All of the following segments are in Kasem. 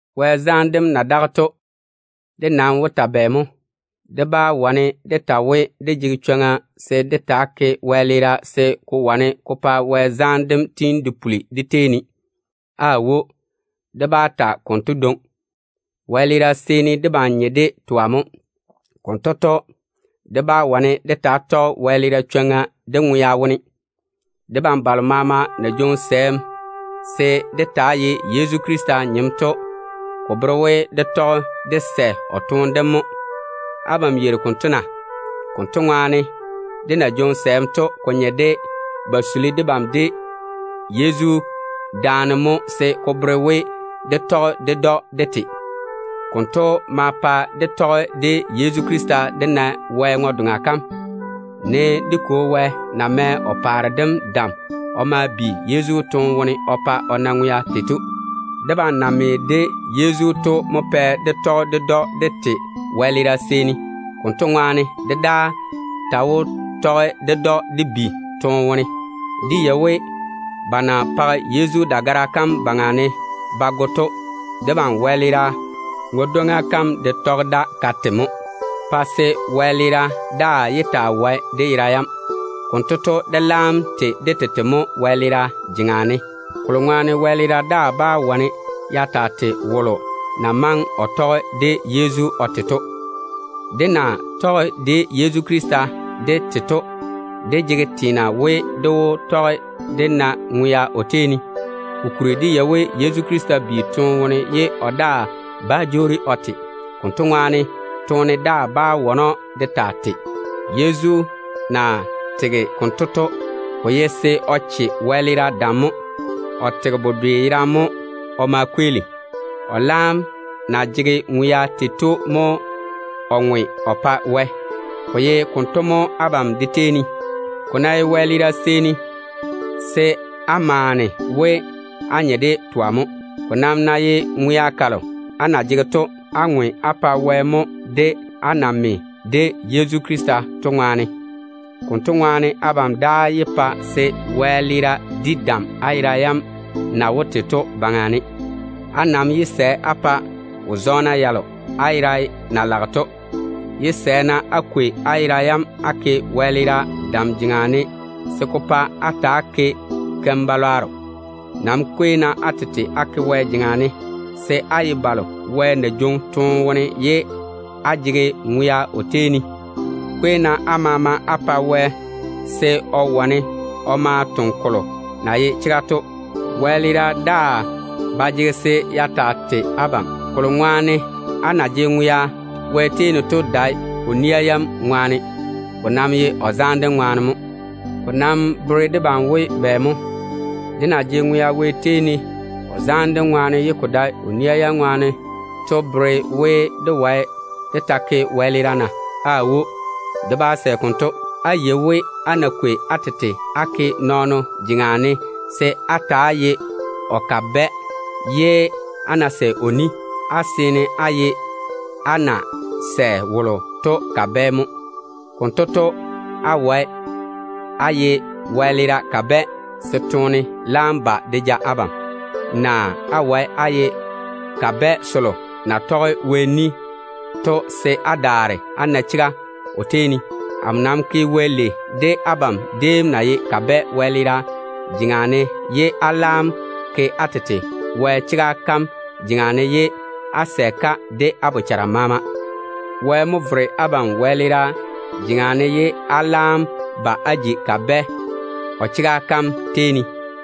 Wɛ zaane dem na daga to, dé nam wó ta bɛ mo? Dé wó wane dé ta we, dé jege chwoŋa se dé taa ke wɛleera se ko wane ko pa Wɛ zaane dem tiini de puli dé tei ne mo na? Aawo, dé bá ta konto dwoŋi. Wɛleera seeni debam nye de twa mo. Konto to, dé ba jege chwoŋa se dé taa ke wɛleera dé ŋwea wone. Debam balo maama na jwoŋi sɛɛm se dé taa ye Yezu Krista nyem to, ko bere we dé tɔge dé sɛ o toone dem mo. Abam yeiri konto na? Konto ŋwaane, dé na jwoŋi sɛɛm to, ko nye de ba suli debam de Yezu daane mo, se ko bere we dé tɔge ded‑o de te. Konto ma pa dé tɔge de Yezu Krista dé na Wɛ ŋwe-doŋa kam, ne dé Kwo Wɛ na mɛ o paare dem dam o bi Yezu toone wone o pa o na ŋwea tei to. Debam na me de Yezu to mo pɛ dé tɔge ded‑o dé te wɛleera seeni. Konto ŋwaane, dé daa ta wó tɔge ded‑o dé bi toone wone. Dé yei we, ba na page Yezu dagara kam yuu ne ba go to, dé ŋwe-dwoŋa kam de tɔge da ka te mo, pa se wɛleera daa yé taa wae dé yera yam. Konto to, dé laam tei dé tete mo wɛleera jeŋa ne, kokuri to wɛleera daa bá wane ya taa tei wolo na maŋe o tɔge de Yezu o te to. Dé na tɔge de Yezu Krista dé te to, dé jege teena we dé wó tɔge dé na ŋwea o tei ne. Kokuri dé yei we Yezu Krista bi toone wone ye o daa bá jwoori o te. Konto ŋwaane, toone daa bá wane‑o de taa tei. Yezu na tege konto to, ko ye se o che wɛleera dam mo. O tege bedwe yerane mo o ma kweeli. O laam na jege ŋwea tei to mo o ŋwe o pa Wɛ. Ko ta ye konto mo abam de tei ne. Ko ná ye wɛleera seeni, se á maane we á nye de twa mo. Ko nam ná ye ŋwea kalo á na jege to, á ŋwe á pa Wɛ mo, á na me de Yezu Krista to ŋwaane. Konto ŋwaane abam daa yé pa se wɛleera di dam á yera yam na wó te to baŋa ne. Á nam yé sɛ á pa wo-zɔɔna yalo á fera na zoore to. Yé sɛ-na á kwei á yera yam á ke wɛleera dam jeŋa ne, se ko pa á ta‑á ke keim-balwaaro. Nam kwei-na á tete á ke Wɛ jeŋa ne, á na ye balo Wɛ na jwoŋi toone wone ye á jege ŋwea o tei ne to ŋwaane. Kwei-na á maama á pa Wɛ se o wane o ma o toŋe kolo na ye chega to. Wɛleera daa ba jege se ya taa tei abam, kokuri to, á na jege ŋwea Wɛ tei ne to dae o nia yam ŋwaane, ko nam ye o zaane dem ŋwaane mo. Ko nam bere debam we bɛ mo? Dé na jege ŋwea Wɛ tei ne o zaane dem ŋwaane ye ko dae o nia yam ŋwaane to bere we dé jege chwoŋa se dé taa ke wɛleera na? Aawo, dé bá sɛ konto. Á yei we, á ná kwei á tete á ke nɔɔno jeŋa ne se á ta‑á ye o kabɛ ye á sɛ o ni, á seene á ye á na sɛ á pa wolo to kabɛ mo. Konto to, á wae á ye wɛleera kabɛ se toone laam ba de ja abam, naa á wae á ye kabɛ selo na toŋe á tɔge Wɛ ni to se á daare á na chega o tei ne. Amo nam ke Wɛ lei de abam déem na ye kabɛ wɛleera jeŋa ne, ye á laam ke á tete Wɛ chega kam jeŋa ne se á ta‑á tɔge-ka de á bochara maama. Wɛ mo vere abam wɛleera jeŋa ne, ye á laam ba á ji kabɛ o chega kam tei ne.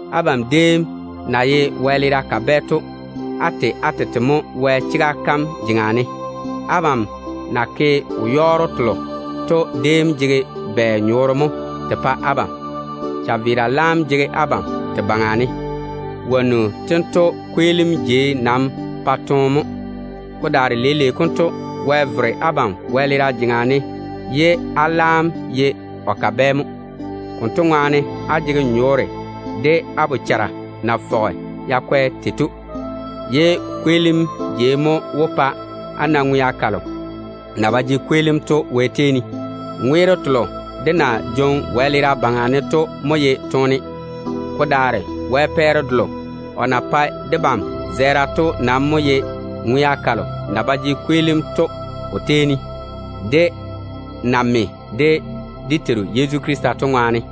Abam déem na ye wɛleera kabɛ to, á tei á tete mo Wɛ chega kam jeŋa ne. Abam na ke wo-yɔɔro telo to déem jege bɛ nyɔɔre mo te pa abam? Chaveera laam jege abam te baŋa ne. Wonnu tento kweelim jei nam pae toone mo. Ko daare leile konto, Wɛ vere abam wɛleera jeŋa ne ye á laam ye o kabɛ mo. Konto ŋwaane, á jege nyɔɔre de á bochara na fɔge ya kwɛ tei to, ye ko kweelim jei mo wó pa á na ŋwea kalo na ba jege kweelim Wɛ tei ne to. Ŋweero telo dé na jwoŋi wɛleera baŋa ne to mo ye toone. Ko daare Wɛ pɛɛre delo o na pae debam zɛɛra to nam mo ye ŋwea kalo na ba jege kweelim o tei ne to, dé na me de dé Teiru Yezu Krista to ŋwaane.